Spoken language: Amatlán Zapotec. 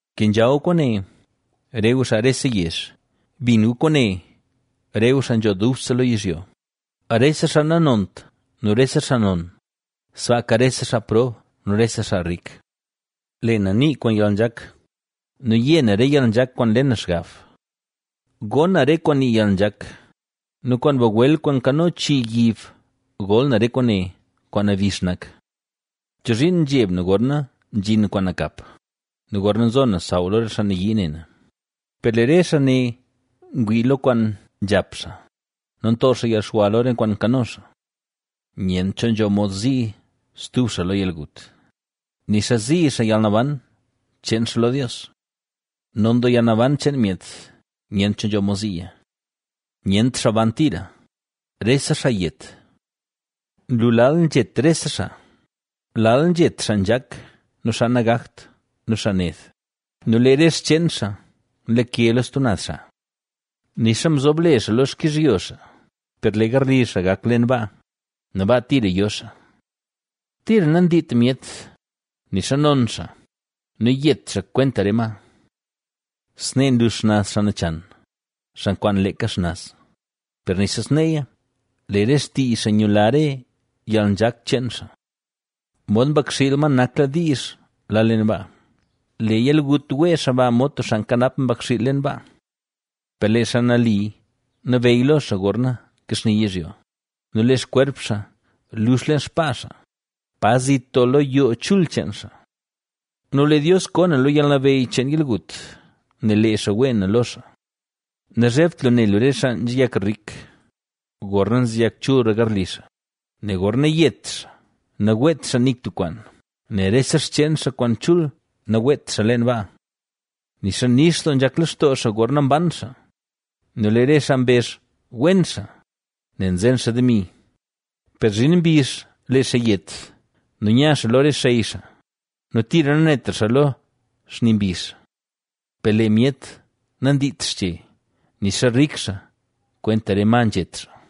Kenzha gu kwaane, re gu xaa rese yezh; bin gu kwaane, re gu xaa nzho dubse lo yizhyo, rese xaa nanont nu rese xaa non, sbaaka rese xaa prob nu rese xaa rik. Lee na nii kwaan yalnzhak nu yé na re yalnzhak kwaan nle na xgab. Gon na re kwaan nii yalnzhak nu kwaan bagwel kwaan nkano chii yib gol na re kwaane, kwaan nabix nak. ¿Chozhiin zheb na gorna zhin kwaan nakap nu gorna zo na saw lo re xaa nayii ne na? Per lee re xaa ne ngwii lo kwaan nzhap xaa nu nto xaa yalxwa lo re kwaan nkano xaa. Nyent cho nzho mod zii stub xaa lo yalgut, nixa zii xaa yalnaban cheen xaa lo Dios. Non doo yalnaban cheen myet, nyent cho nzho mod ziiya. Nyent xaa ban tira, rese xaa yet. Nlu lal nzhet rese xaa; lal nzhet xaa nzhak nu xaa nagakt nu xaa ned nu lee re xcheen xaa nlake lo stub naz xaa. Nixa mzob le xaa lo xkizhyo xaa, per lee garli xaa gak leen baa nu baa tira yo xaa. Tira nandiit myet, nixa non xaa nu yet xaa kwenta re ma. Snee nlux xnaz xaa nachan, xaa nkwaan leeka xnaz, per nixa sneeya lee re xtii xaa nyula re yalnzhak cheen xaa. Mod mbakxiil ma nakla diizh la leen baa; lee yalgut wee xaa ba mod tub xaa nkanap mbakxiil leen baa. Per lee xaa nali nabeyy lo xaa gorna kaxni yizhyo. Nu lee xkwerp xaa lux leen xpaa xaa, pa zit doo lo yoo chul cheen xaa. Nu lee Dios koo na lo yalnabeyy cheen yalgut, nel lee xaa wee na lo xaa. Nazhebt lu ne lu re xaa nzeyak rik, gorna nzeyak chulra garli xaa, nel gorna yet xaa naweet xaa nik tub kwaan, nel rese xcheen xaa kwaan chul naweet xaa leen baa. Nixa nix doo nzhak lextoo xaa gorna mban xaa nu lee re xaa mbezh wen xaa, nel nzen xaa demi, per zhin mbizh lee xaa yet nu nya xaa lo re xey xaa nu tira nanetra xaa lo xni mbizh. Per lee myet nandiit xche, nixa rik xaa, kwenta re ma nzhet xaa.